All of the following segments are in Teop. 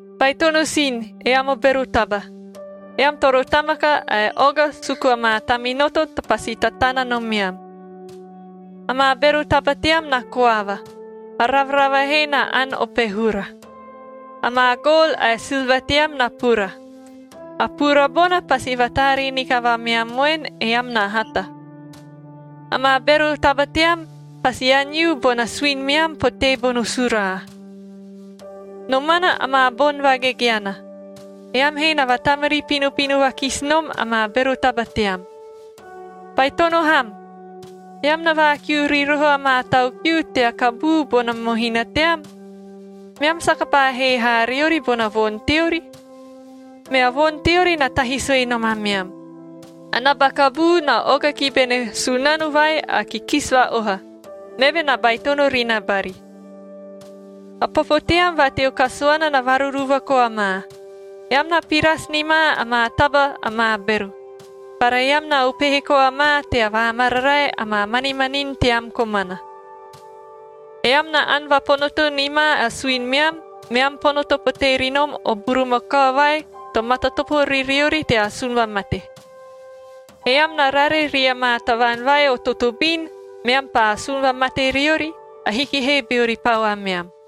Baitono sin, eam o bero taba! Eam toro tamaka ae oga suku amaa taminoto to pasi tatana nomeam. Amaa bero taba team na koava, a ravarava he na ani o pehura. Amaa gol ae silva team na pura. A pura bona pasi vataaree ni kavameam voen, eam na hata. Amaa bero taba team pasi aniu bona suini meam potee bono suraa.a Nomana amaa boni vagegeana, eam he na vatamari pinopino vakisi nom amaa bero taba team. Baitono ham! Eam na vaakiu ri roho amaa tau kiu tea kabuu bona mohina team, meam saka paa hee haa riori bona voni teori. Mea voni teori na tahi sue nom ameam. A naba kabuu na oga ki bene Sunano vai a Kikisi Va-oha, meve na baitono ri na bari. A popo team va teo kasuana na varuruva koa ma. Eam na pirasi ni ma amaa taba amaa bero, bara eam na upehe koa ma tea vaamararae amaa manimanin team komana. Eam na ani vaponoto ni ma a suini meam, meam ponoto potee ri nom o burumakao vai to matatopo ri riori tea asun vamate. Eam na rare ria maa tavaan vai o totobin, meam paa asun vamate riori, ahiki he beori pau ameam.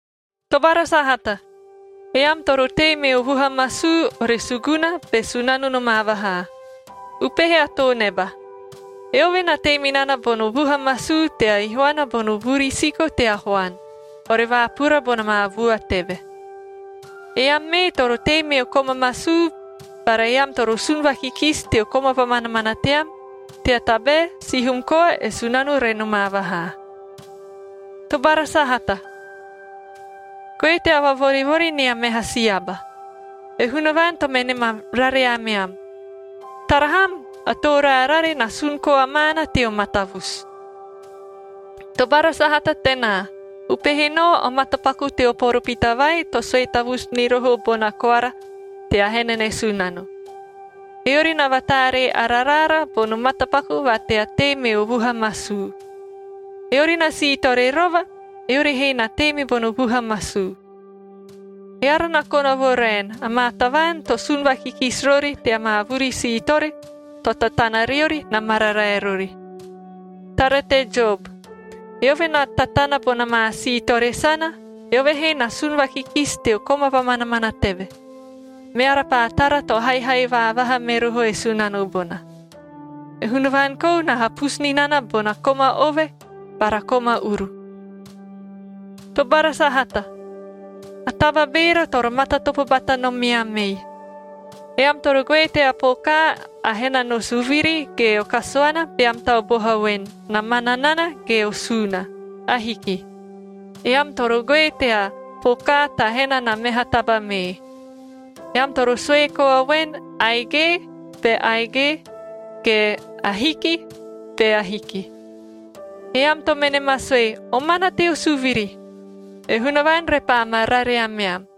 Tobara sahata, eam toro tei meo vuha masuu, ore suguna be Sunano nomaa vahaa. Upehe a too neba – eove na tei me nana bono vuha masuu tea ihuana bono vuri siko tea huan, ore vaapura bona maa vua teve. Eam mee toro tei meo koma masuu bara eam toro sun vakikisi teo koma vamanamana team, tea tabae sihum koa e Sunano re nomaa vahaa. Tobara sahata, goe tea vavorivori nia meha si aba. E Hunavaan to mene ma rare ameam. Tara ham! A Too Raarare na sun koa maana teo matavusu. Tobara sahata tenaa, upehe nao o matapaku teo poropita vai to sue tavusu ni roho bona koara tea hena ne Sunano. Eori na vataaree ara raara bono matapaku va tea tei meo vuha masuu. Eori na siitore rova, eori he na tei me bono vuha masuu. Eara na kona vo raen, amaa tavaan to sun vakikisi rori tea maa vuri siitore to tatana riori, na mararae rori. Tara te Job, eove na tatana bona maa siitore sana, eove he na sun vakikisi teo koma vamanamana teve, meara paa tara to haihai vaavaha me roho e Sunano bona. E Hunavaan kou na hapusu ni nana bona koma ove bara koma uru. Tobara sahata, a taba beera toro matatopo bata nomeam ei, eam toro goe tea pokaa a hena no suviri ge o kasuana beam tau boha voen, na mana nana ge o suuna. Ahiki. Eam toro goe tea pokaa ta hena na meha taba mee. Eam toro sue koa voen, “Aige,” be aige, ge “Ahiki” be ahiki. Eam to mene ma sue, “Omana teo suviri,” e Hunavaan repaa ma rare ameam.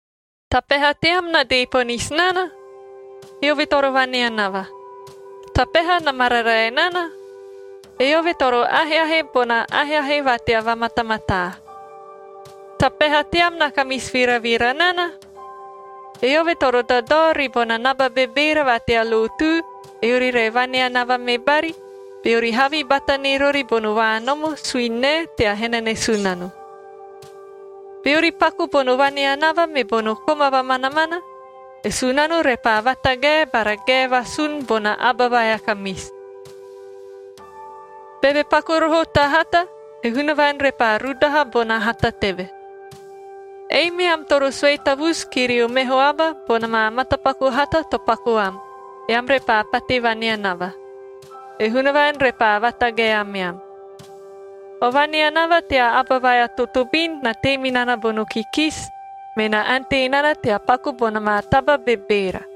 Ta peha team na dee ponisi nana? Eove toro vaneanava. Ta peha na mararae nana? Eove toro aheahe bona aheahe va tea vamatamataa. Ta peha team na kamisi viravira nana? Eove toro dadao ribona naba bebeera va tea lotu, eori re vaneanava me bari, beori havi bata ni rori bono vaanomo suini nae tea hena ne Sunano. Beori paku bono vaneanava me bono koma vamanamana, e Sunano repaa vatagae bara gae vasun bona aba vai a kamisi. Beve paku roho ta hata, e Hunavaan repaa rudaha bona hata teve. Ei meam toro sue tavusu ki rio meho aba bona maa matapaku hata to paku am, eam repaa pate vaneanava. E Hunavaan repaa vatagae ameam. O vaneanava tea aba vai a totobin na tei me nana bono kikisi, me na ante nana tea paku bona maa taba bebeera.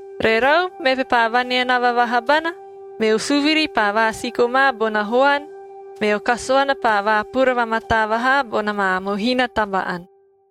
Rerau, meve paa vaneanava vaha bana, meo suviri paa vaasiko ma bona huan, meo kasuana paa vaapura vamataa vahaa bona maa mohina taba-ani.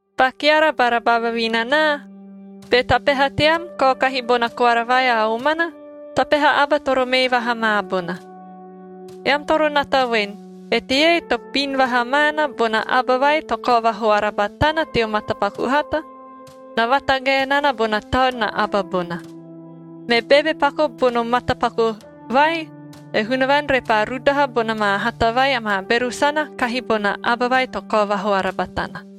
Ba keara bara ba vavinanaa, be ta peha team kaokahi bona koara vai a omana, ta peha aba toro mee vaha ma bona. Eam toro nata voen, eteie to bin vaha maana bona aba vai to kao vahoara batana teo matapaku hata, na vatagae nana bona taun na aba bona. Me beve paku bono matapaku vai, e Hunavaan repaa rudaha bona maa hata vai amaa bero sana kahi bona aba vai to kao vahoara batana.